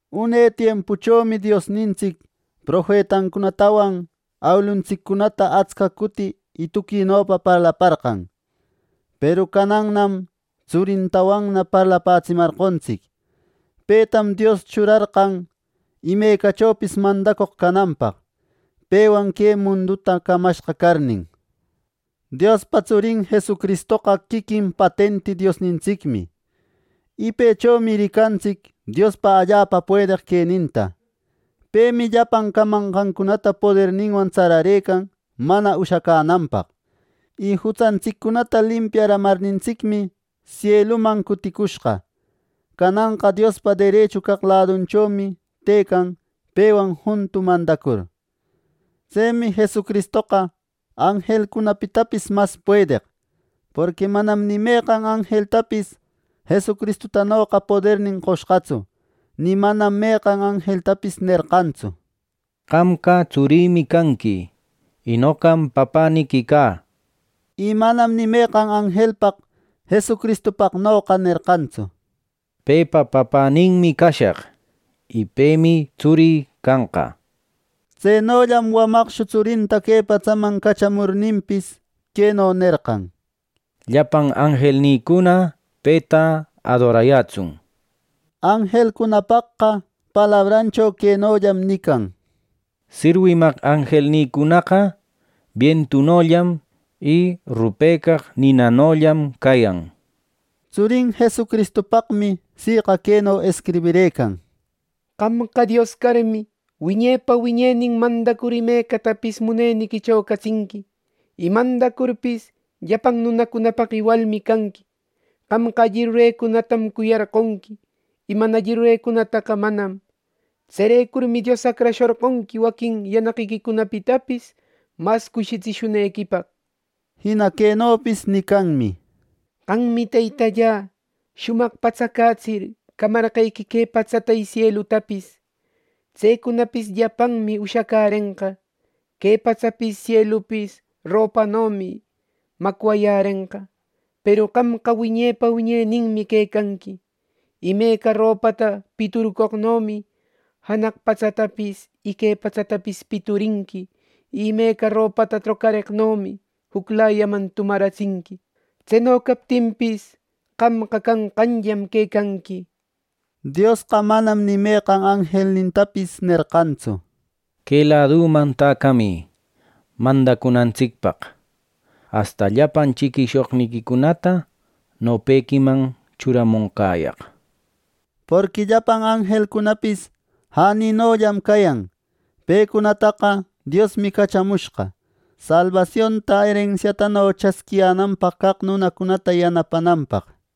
Une tiempuchomi Diosnintsic profetancunatawan awiluntsiccunata atsca cuti y tuquinopa parlaparqan; peru canannam tsurintawanna parlapätsimarqontsic. Petam Dios churarqan imecachopis mandacoq cananpaq, pewan que munduta camashqa carnin. Diospa tsurin Jesucristoqa quiquin patenti Diosnintsicmi, y pëchomi ricantsic Diospa allapa puedeq queninta. Pemi llapan camanqancunata poderninwan tsararëcan mana ushacänanpaq. Y jutsantsiccunata limpiaramarnintsicmi, sieluman cuticushqa. Cananqa Diospa derechu caq ladunchomi tëcan pewan juntu mandacur. Tsemi Jesucristoqa anjelcunapitapis mas puedeq, porqui manam ni meqan anjeltapis Jesucristutanoqa podernin qoshqatsu, ni manam meqan anjeltapis nerqantsu: “Qamqa tsurïmi canqui, y noqam papäniqui cä” nir. Y manam ni meqan anjelpaq Jesucristupaqnoqa nerqantsu: “Pepa papäninmi cashaq y pemi tsurï canqa” Tsenollam wamaqshu tsurinta que patsaman cachamurninpis, queno nerqan: “Llapan anjelnïcuna peta adorayätsun” nir. Anjelcunapaqqa palabrancho quenollam nican: “Sirwimaq anjelnïcunaqa bientunollam y rupecaq ninanollam cayan” nir. Tsurin Jesucristupaqmi siqa queno escribirëcan: “Qamqa Dios carmi, wiñepa wiñenin mandacur imecatapis muneniquicho catsinqui; y mandacurpis, llapan nunapaq iwalmi canqui. Qamqa alli rurecunatam cuyarqonqui, y mana alli rurecunataqa manam. Tserecurmi Dios acrashorqonqui waquin yanaqiquicunapitapis mas cushitsishunequipaq” nir. Jina quenopis nicanmi: “Qammi Teytallä, shumaq patsacätsir, camarqequi que patsata y sielutapis. Tsecunapis llapanmi ushacärenqa. Que patsapis sielupis ropanomi macwayärenqa; peru qamqa wiñepa wiñeninmi quecanqui. ¡Imeca ropata piturcoqnomi janaq patsatapis y que patsatapis piturinqui y imeca ropata trocareqnomi juclayaman tumaratsinqui! Tseno captinpis, qamqa canqanllam quecanqui” nir. Diosqa manam ni meqan anjelnintapis nerqantsu: “Que ladüman täcamï mandacunantsicpaq, asta llapan chiquishoqniquicunata nopequiman churamonqäyaq” nir. Porqui llapan anjelcunapis jäninollam cayan. Pecunataqa Diosmi cachamushqa, salbasionta erensiatano chasquiyänanpaq caq nunacunata yanapananpaq.